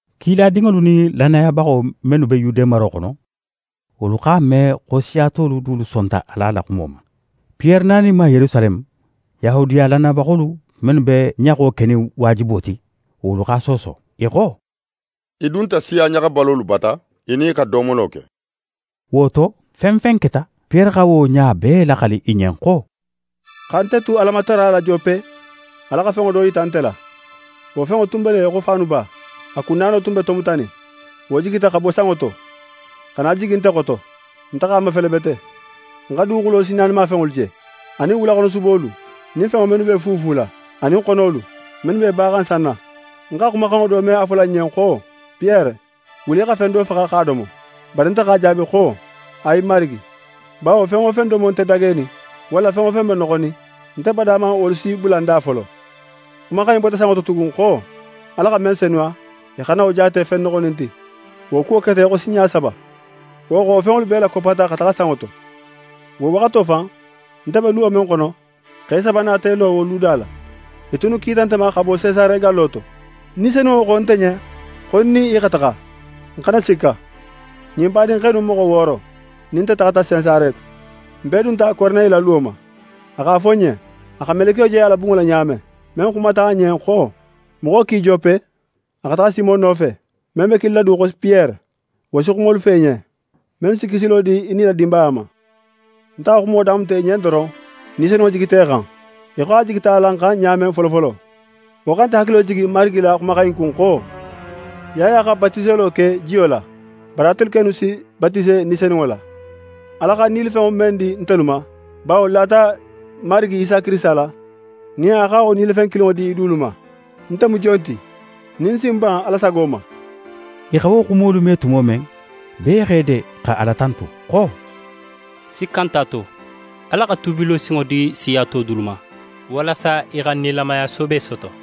Kiladinŋolu nin lannayabaxo mennu be Yude maro xono, wolu x'a me xo siya tolu dulu sonta Ala la xumo ma. Piyere naninma Yerusaleme, Yahudiya lannayabaxolu mennu be ɲaxo kenin waajibo ti, wolu x'a sooso. I xo: «Í dunta siya ɲaxabalolu bata, í nin i xa domolo ke!» Wo to, fen fen keta, Piyere xa wo ɲa bee laxali i ɲen xo: «Xa nte tu Alamatara la Jope, Ala xa fenŋo do yita nte la. Wo fenŋo tun be í xo faanuba. A kun naano tun be tomutanin. Wo jigita xa bo sanŋo to, xa na jigi nte xoto. Nte x'a mafele bete. Ń xa duguxulo sinnaanimafenŋolu je, anin wulaxonosubolu nin fenŋo mennu b'e fuufula, anin xonolu, mennu b'e baxan sanna. Ń xa xumaxanŋo do me a fola ń ɲen xo: “Piyere, wuli í xa fen do faxa x'a domo.” Bari nte x'a jaabi xo: “Ayi Marigi! Bawo fen wo fen domo nte dagenin, walla fen wo fen be noxonin, nte bada man wolu si bula ń da folo.” Xumaxan in bota sanŋo to tugun xo: “Ala xa men senuya, í xana wo jaate fen noxonin ti.” Wo kuwo keta í xo sinɲa saba. Wo xo, wo fenŋolu bee lakoppata xa taxa sanŋo to. Wo waxato fan, nte be luwo men xono, xe saba nata i lo wo luda la. I tunnu kita nte ma xa bo Sesare gallo to. Ni Senunŋo xo nte ɲen xo ń nin i xa taxa, ń xana sikka. Ɲin badinxe innu moxo wooro nin nte taxata Sesare. N bee dunta Koroneyi la luwo ma. A x'a fo n ɲen a xa melekiyo je a la bunŋo la ɲa men, men xumata a ɲen xo: “Moxo ki Jope, a xa taxa Simon nofe, men be kilila du xo Piyere. Wo si xumolu fo í ɲen, mennu si kisilo di í nin í la dinbaya ma.” Nte xa xumo damuta i ɲen doron, Ni Senunŋo jigita i xan, í xo a jigita alan xan ɲa men folofolo. Wo xa nte hakilo lajigi Marigi la ɲin xuma in kun xo: “Yaya xa batiselo ke jiyo la, bari atelu kennu si batise Ni Senunŋo la.” Ala xa nilifenŋo men di ntelu ma, bawo n lata Marigi Isa Kirisita la, nin a xa wo nilifen kilinŋo di i dulu ma, nte mu jon ti, nin ń si ń ban Ala sago ma?» I xa wo xumolu me tumo men, bee x'e de xa Ala tantu xo: «Sikka nt'a to, Ala xa tuubilo sinŋo di siya to dulu ma, walasa i xa nilamaya soobe soto.»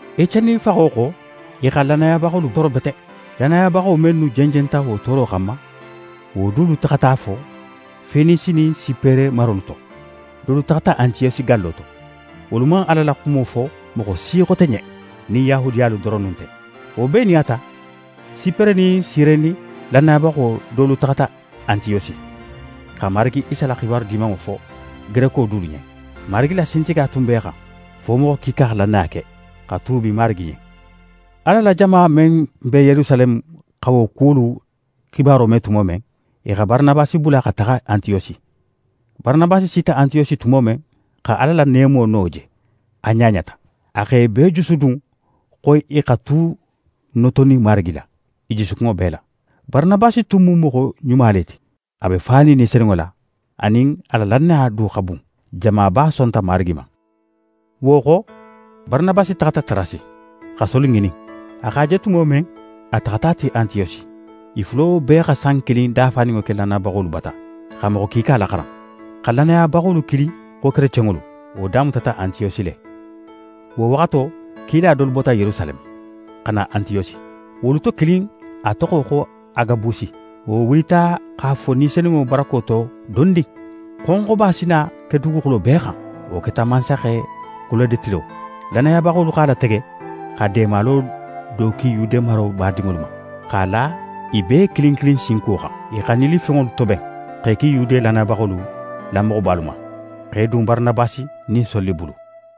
Eceni faxo xo, i xa lannayabaxolu tooro bete. Lannayabaxo mennu jenjenta wo tooro xanma, wolu dolu taxata fo Fenisi nin Sipere marolu to. Dolu taxata Antiyosi gallo to. Wolu man Ala la xumo fo moxo si xote ɲen, nin Yahudiyalu doronnu nte. Wo bee nin a ta, Sipere nin Sireni lannayabaxo dolu taxata Antiyosi, xa Marigi Isa la xibaru Dimanŋo fo Gereko dulu ɲen. Marigi la sintigiya tun b'e xan, fo moxo kiika xa lannaya ke, xa tuubi Marigi ɲen. Ala la jama men be Yerusaleme xa wo kuwolu xibaro me tumo men, i xa Baranabasi bula xa taxa Antiyosi. Baranabasi sita Antiyosi tumo men, xa Ala la neemo no je, a ɲaɲata. A x'e bee jusudun xo i xa tu notonin Marigi la, i jusukunŋo bee la. Baranabasi tun mu moxo ɲuma le ti; a be fanin Ni Senunŋo la, anin a la lannaya du xa bun. Jamaba sonta Marigi ma. Wo xo, Baranabasi taxata Tarasi, xa Soli ŋinin. A x'a je tumo men, a taxata a ti Antiyosi. I fulo bee xa san kilin dafaninŋo ke lannayabaxolu bata, xa moxo kiika laxaran. Xa lannayabaxolu kili xo “kerecenŋolu”, wo damutata Antiyosi le. Wo waxato, kila dolu bota Yerusaleme, xa na Antiyosi. Wolu to kilin, a toxo xo Agabusi, wo wulita x'a fo Ni Senunŋo barako to xo dondin, xonxoba si na ke duguxulo bee xan. Wo keta mansaxe Kulode tilo. Lannayabaxolu x'a latege, xa deemalo do ki Yude maro badinŋolu ma, x'a la i bee kilin kilin sinkuwo xan. I xa nilifenŋolu toben, x'e ki Yude lannayabaxolu la moxobalu ma, x'e dun Baranabasi nin Soli bulu.